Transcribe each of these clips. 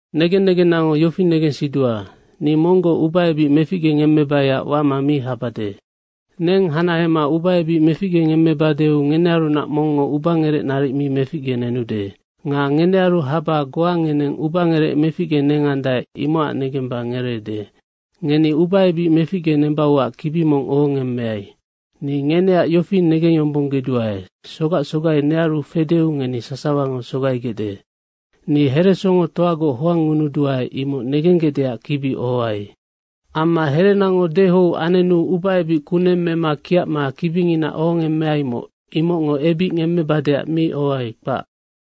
Negen negennango yofi negensidua, ni monggoc ubaebic meficgengemmebaiac wama mi habade. Neng hanahema ubaebic meficgengemmebadeu ngenearunac mongngo ubangerec naric mi meficgenenude. Nga ngenearu haba goa ngeneng ubangerec meficgenengandae, imocac negemba ngereede. Ngeni ubaebic meficgenembauac kibi mong ohongemmeai. Ni ngeneac yofi negengyombonggeduae, sogac sogai nearu fedeu ngeni sasawango sogaigecde. Ni heresongotoagoc hoangngunuduae, imoc negenggecdeac kibi ohoai. Amma herenango dehou anenu ubaebic kuneng mema kiacma kibingina ohongemmeaimoc, imocngo ebic ngemmebadeac mi ohoai, kpac.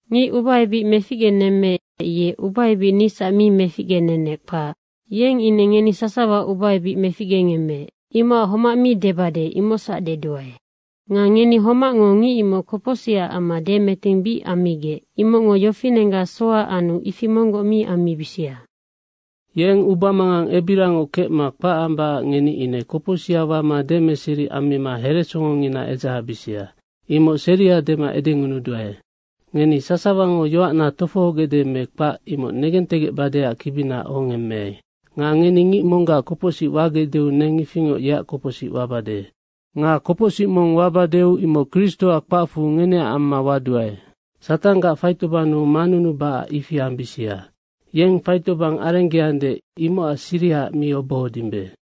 Ngic ubaebic meficgenemmeec, ye ubaebic nisac mi meficgenenec, kpac. Yeng ine ngeni sasawa ubaebic meficgengemmeec. Imocac homac mi debade, imocsac deduae. Nga ngeni homacngo ngic imoc kopocsihaac amma demeting bic ammigec, imocngo yofinenggac soha anu ifi monggoc mi ammibisia. Yeng ubamangang ebirangoc kecma kpac ambacac ngeni ine kopocsiha wama demeseri ammima heresongongina edzahebisia, imoc seria dema edengunuduae. Ngeni sasawango yoacna tofohogecde me kpac, imoc negentegecbadeac kibina ohongemmeai. Nga ngeni ngic monggac kopocsic wagecdeu neng ifingoc yeac kopocsic wabade. Nga kopocsic mong wabadeu imoc Kristoac kpacfu ngeneac amma waduae. Satanggac faitobannu manunubacac ifi ambisia. Yeng faitobang arenggeande, imocac sirihaac mi obohodimbe.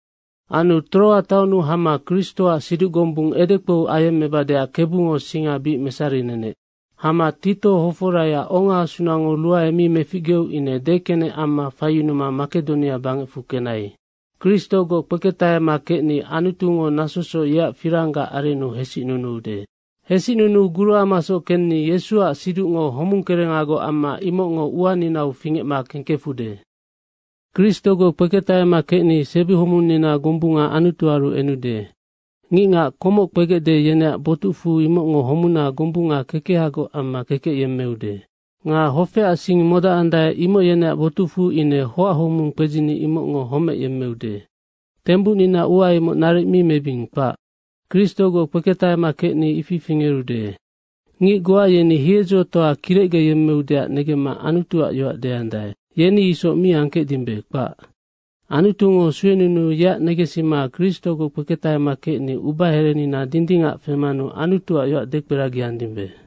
Anu Troa taonnu hama Kristoac siduc gombung edekpou ayemmebadeac Kebungo singa bic mesarinenec. Hama Tito hoforaiac ongaasunango ruae mi meficgeu ine dekenec amma faiyunuma Makedonia bangecfu kenai. Anu Kristogoc kpeketahema kecni Anutungo nasosoc yeac firanggac arennu hesicnunuude. Hesicnunuu guruamasoc kenni Yesuac siducngo homung kerengagoc amma imocngo uaninau fingecma kengkefude. Kristogoc kpeketahema kecni sebihomunnina gombunga Anutuaru enude. Ngicngac komoc kpegecde, yeneac botucfu imocngo homuna gombunga kekehagoc amma kekec yemmeude. Nga hofeac sing modacandae, imoc yeneac botucfu ine hoachomung kpedzini imocngo homec yemmeude. Tembucnina ua imoc naric mi mebing, kpac. Kristogoc kpeketahema kecni ifi fingerude. Ngic goa yeni hiedzotoa kirecgeyemmeudeac negemma Anutuac yoac deandae. Yeni isoc mi angkecdimbe, kpac. Anutungo suenunuu yeac negensima Kristogoc kpeketahema kecni ubaherenina dindingac femanu Anutuac yoac dekperagiandimbe.